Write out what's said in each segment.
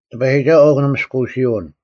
ᑎᐸᔨᒋᒐᓱᐤ ᐊᐅᒄ ᓂᒥᔅᑯᓯᐅᓐ;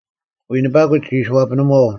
ᐎᓂᐸᑯᒡ ᒋ ᐃᓯ ᐛᐱᓂᒺᐤ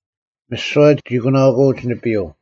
ᒥᓯᐛ ᒋ ᑯᓇᐅᑯᐅᒡ ᓂᐱᔪᐤ;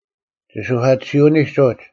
ᒋᓱᐧᑲᑎᓯᐅᓂᒡ ᐅᒡ,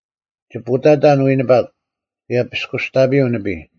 ᒋ ᐳᑕᑕᓐ ᐎᓇᐸᒄ ᑭᔭ ᐱᔅᑯᔅᑕᐱᔪᐤ ᓂᐱᔾ;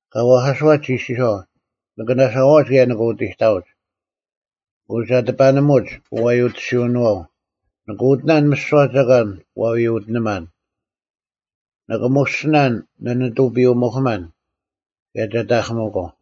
ᑲ ᐛᐧᑲᓱᐛᑦ ᒋ ᐃᔅᒋᔄᐤ, ‘ᓂᑭ ᓇᓴᐛᐅᒡ ᑭᔭ ᓂᑭ ᐅᑎᑕᐅᒡ᙮ ᐊᑯ ᒐ ᑎᐸᓂᒧᒡ ᐅᐛᔪᑎᓯᐅᓄᐛᐤ᙮ ᓂᑭ ᐅᑎᓇᓐ ᒥᓯᐛ ᒐᒂᓐ ᐛ ᐎᐅᑎᓂᒪᓐ᙮ ᓂᑭ ᒧᔅᒋᓇᓐ ᓂᓂᑐᐱᔪᐅ-ᒧᐧᑯᒪᓐ ᑭᔭ ᒐ ᑕᐧᑭᒥᒂᐤ᙮’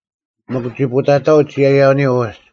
ᒥᒄ ᒋ ᐳᑕᑕᐅᒡ ᒋᔭᔭᐅᓂᔪᐤ ᐅᒡ,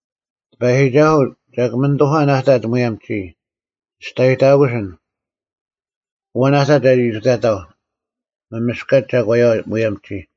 ᑎᐸᔨᒋᒐᓱᐤ, ᒐᒄ ᒥᓂᑐᐧᑲᓐ ᐊ ᑕᑦ ᒧᔭᒻ ᒋᔾ, ᒋᔅᑕᔨᑕᑯᓯᓐ, ᐊᐛᓐ ᐊ ᑕᑦ ᒐᒋ ᐃᑐᑕᐧᒃ ᒪᒥᔅᑲᒡ ᒐᒂᔪᐛ ᒧᔭᒻ ᒋᔾ!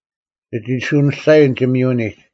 ᒋ ᒋᓱᐅᓂᔅᒐᔨᓐ ᒋᒥᔪᐅᓂᒡ,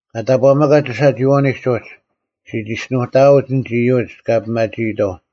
ᑲ ᑕᑈᒥᑲᒡ ᒋᓴᒋᐃᐛᐅᓂᒡ ᐅᒡ, ᔅᒋ ᒋᔅᒋᓄᑕᐅᒡ ᐊᓐᒡ ᐃᔪᒡ ᑲ ᐱᒪᒋᐃᑥᐤ;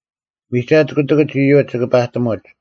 ᒥᒐᑦ ᑯᑎᑭᒡ ᐃᔪᒡ ᒋᑭ ᐸᑎᒧᒡ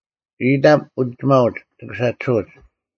ᐃᑕᒻ ᐅᒋᒪᐅᒡ ᒋᑭ ᓴᒋᓱᐅᒡ᙮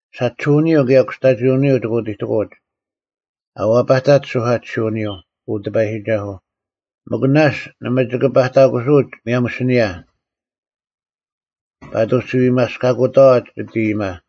ᓴᒋᓱᐅᓂᔪᐤ ᑭᔭ ᑯᔅᑕᒋᐅᓂᔪᐤ ᒋᑭ ᐅᑎᑎᑯᐅᒡ᙮ ᐊ ᐛᐸᑕᒡ ᒋᓱᐧᑲᑎᓯᐅᓂᔪᐤ, ᐅ ᑎᐸᔨᒋᒐᓱᐤ, ᒥᒄ ᓇᔅᒡ ᓇᒪ ᒋᑭ ᐸᑕᑯᓱᐅᒡ ᒧᔭᒻ ᐊᓯᓂᔭ ᐸᑐᔅ ᒋ ᐎᒪᔅᑲᑯᑥᐛ ᒋᑦ ᐃᔨᒪ,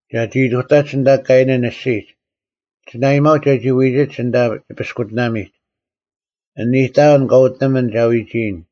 ᒐᒋ ᐃᑐᑕᒡ ᐊᓐᑕ ᑲᐃᓇᓐ ᐊᔅᒋᒡ, ᒋ ᓇᐊᔨᒪᐅᒡ ᒐᒋ ᐎᒋᒡ ᐊᓐᑕ ᒋᐱᔅᑯᑎᓇᒥᒡ, ᐊᓐ ᐃᑕᐅᓐ ᑲ ᐅᑎᓂᒥᓐ ᒐ ᐎᒋᔨᓐ,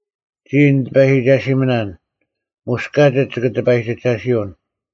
ᒋᔾ, ᓂᑎᐸᔨᒋᒐᓯᒥᓇᓐ, ᒧᔅ ᑲᒋᒡ ᒋᑭ ᑎᐸᔨᒋᒐᓯᐅᓐ!”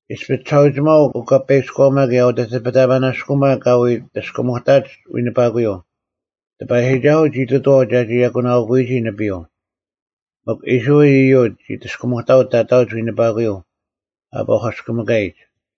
ᐃᔅᐱ ᒋᓴᐅᒋᒪᐤ ᐅᑲᐸᐃᑭᔎᒪ ᑭᔭ ᐅᑎᑎᐱᑕᐸᓇᔅᑯᒪ ᑲ ᐎ ᑎᔅᑭᒧᑕᒡ ᐎᓂᐸᑯᔪᐤ, ᑎᐸᔨᒋᒐᓱᐤ ᒋ ᑐᑐᐛᐤ ᒐᒋ ᐊᑯᓇᐅᑯᐎᒋ ᓂᐱᔪᐤ᙮ ᒥᒄ ᐃᔅᕋᐃᓪ ᐃᔪᒡ ᒋ ᑎᔅᑭᒧᑕᐅᒡ ᑕᑕᐅᒡ ᐎᓂᐸᑯᔪᐤ ᐊ ᐸᔎᑭᒥᑲᔨᒡ᙮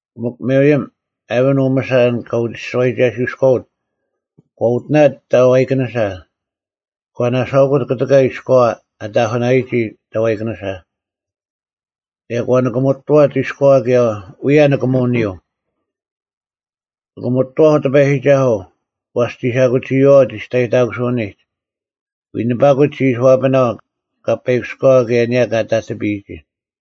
ᐊᑯ ᒥᕆᔭᒻ, ᐊᕋᓐ ᐅᒥᓴ ᐊᓐ ᑲ ᐅᒋᔅᒋᐛᐃᒐᓯᐅᔎᐅᑦ ᒂ ᐅᑎᓇᑦ ᑕᐛᐃᑭᓂᓴ, ᒂ ᓇᓴᐅᑯᑦ ᑯᑎᑲ ᐃᔎᐛ ᐊ ᑕᐧᑯᓇᔨᒋ ᑕᐛᐃᑭᓂᓴ᙮ ᑭᔭ ᒂ ᓂᑭᒧᑐᐛᑦ ᐃᔎᐛ ᐅᔭ ᓂᑭᒧᐅᓂᔪᐤ: “ᓂᑭᒧᑐᐛᐧᒄ ᑎᐸᔨᒋᒐᓱᐤ, ᐛᔅ ᒋ ᓴᐧᑯᒋᐃᐛᐤ ᒋᔅᑕᔨᑕᑯᓯᐅᓂᒡ, ᐎᓇᐸᑯᒡ ᒋ ᐃᓯ ᐛᐱᓇᐤ ᑲᐸᐃᑭᔎᐛ ᑭᔭ ᐊᓂᔭ ᑲ ᑕᑎᐱᔨᒋ᙮”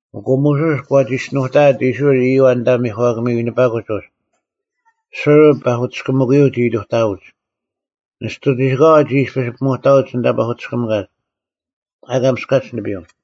ᐊᑯ ᒧᓱᔅ ᒂ ᒋᔅᒋᓄᑕᐊᑦ ᐃᔅᕋᐃᓪ ᐃᔪᐛ ᐊᓐᑕ ᒥᒂᑭᒥ ᐎᓂᐸᑯᒡ ᐅᒡ᙮ ᓱᕐ ᐸᐧᑯᑎᔅᑭᒥᑲᔪᐤ ᒋ ᐃᑐᑕᐅᒡ᙮ ᓂᔅᑐ ᒋᓯᑲᐛ ᒋ ᐃᔅᐱᔅ ᐱᒧᑕᐅᒡ ᐊᓐᑕ ᐸᐧᑯᑎᔅᑭᒥᑲᒡ, ᐊ ᐊᑲ ᒥᔅᑲᒡ ᓂᐱᔪᐤ᙮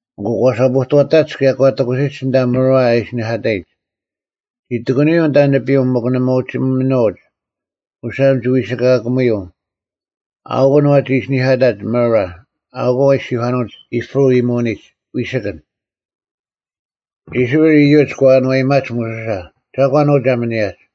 ᐊᑯ ᒂ ᓴᐳᑐᐛᑕᒡ ᑭᔭ ᒂ ᑎᑯᓯᒡ ᐊᓐᑕ ᒪᕋ ᐊ ᐃᓯᓂᐧᑲᑕᔨᒡ᙮ ᒋ ᑎᑯᓂᔪᐤ ᐊᓐᑕ ᓂᐱᔪᐤ ᒥᒄ ᓇᒪ ᐅᒋ ᒥᓄᐅᒡ, ᐅᓴᒻ ᒋ ᐎᓯᑲᐧᑭᒧᔪᐤ᙮ ᐊᐅᑯᓐ ᐛᒋ ᐃᓯᓂᐧᑲᑕᒡ ᒪᕋ᙮ ᐊᐅᑯᐤ ᐊ ᐃᔅᒋᔄᓄᐅᒡ ᐃᑉᕈ ᐃᔨᒧᓂᒡ ‘ᐎᓯᑭᓐ’᙮ ᐃᔅᕋᐃᓪ ᐃᔪᒡ ᒂ ᐊᓏᔨᒪᒡ ᒧᓱᓴ, “ᒐᒂᓐ ᐅ ᒐ ᒥᓂᔭᒡ?”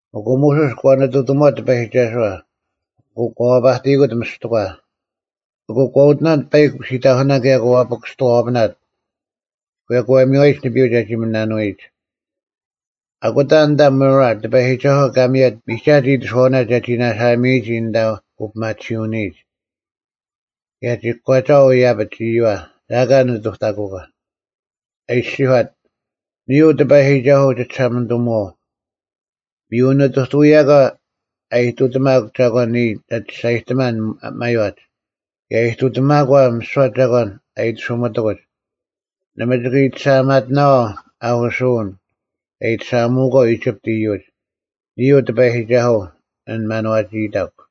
ᐊᑯ ᒧᓱᔅ ᒂ ᓂᑐᑎᒧᐛᑦ ᑎᐸᔨᒋᒐᓱᐛ᙮ ᐊᑯ ᒂ ᐛᐸᑎᔨᑯᑦ ᒥᔅᑎᒂ᙮ ᐊᑯ ᒂ ᐅᑎᓇᑦ ᐸᐃᒄ ᓯᑕᐧᑯᓇ ᑭᔭ ᒂ ᐱᑭᔅᑐᐛᐱᓇᑦ᙮ ᑭᔭ ᒂ ᒥᔽᔨᒡ ᓂᐱᔪᐤ ᒐᒋ ᒥᓇᓄᐎᒡ᙮ ᐊᑯᑕ ᐊᓐᑕ ᒪᕋ, ᑎᐸᔨᒋᒐᓱᐤ ᑲ ᒥᔭᑦ ᒥᒐᑦ ᐃᑎᓱᐛᐅᓇ ᒐᒋ ᓇᓴᒥᔨᒋ ᐊᓐᑕ ᐅᐱᒪᑎᓯᐅᓂᔨᒡ᙮ ᑭᔭ ᒋ ᑯᒂᒐᐤ ᐃᔭᐱᒡ ᐃᔪᐛ, ᒐ ᐊᑲ ᓂᑐᑕᑯᒂ, ᐊ ᐃᔅᒋᔄᑦ, “ᓂᔾ ᐅ ᑎᐸᔨᒋᒐᓱᐤ, ᒋᒋᓴᒪᓂᑐᒧᐛᐤ᙮ ᒥᔪ ᓇᔨᑐᐅᔭᒂ ᐊᔨᑐᑎᒪᒄ ᒐᒂᓐ ᓂᔾ ᒐ ᒋᔅᒐᔨᑎᒪᓐ ᒪᔽᒡ, ᑭᔭ ᐃᑐᑎᒪᒂ ᒥᓯᐛ ᒐᒂᓐ ᐊ ᐃᑎᓱᒥᑎᑯᒡ, ᓇᒪ ᒋᑭ ᐃᑎᓴᒪᐊᒪᑎᓇᐛᐤ ᐊᐧᑯᓱᐅᓐ ᑲ ᐃᑎᓴᒪᐊᒧᒂᐤ ᐃᒋᑉᑦ ᐃᔪᒡ᙮ ᓂᔾ ᐅ ᑎᐸᔨᒋᒐᓱᐤ, ᐊᓐ ᒪᓏᒋᐃᑕᒄ᙮”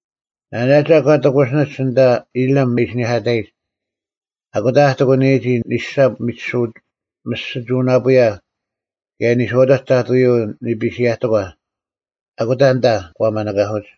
ᓇᓇᒐ ᒂ ᑎᑯᓯᓂᒡ ᐊᓐᑕ ᐃᓕᒻ ᐊ ᐃᓯᓂᐧᑲᑕᔨᒡ᙮ ᐊᓐᑕ ᐊ ᑎᑯᓂᔨᒋ ᓂᓴᑉ ᒥᔅᒋᒍᓇᐳᔭ ᑭᔭ ᓂᔄᐅᑕᒡ ᑕᑐᔪᐤ ᓂᐱᓯᔭᑎᒂ᙮ ᐊᑯᑕ ᐊᓐᑕ ᒂ ᒪᓂᑲᓱᒡ᙮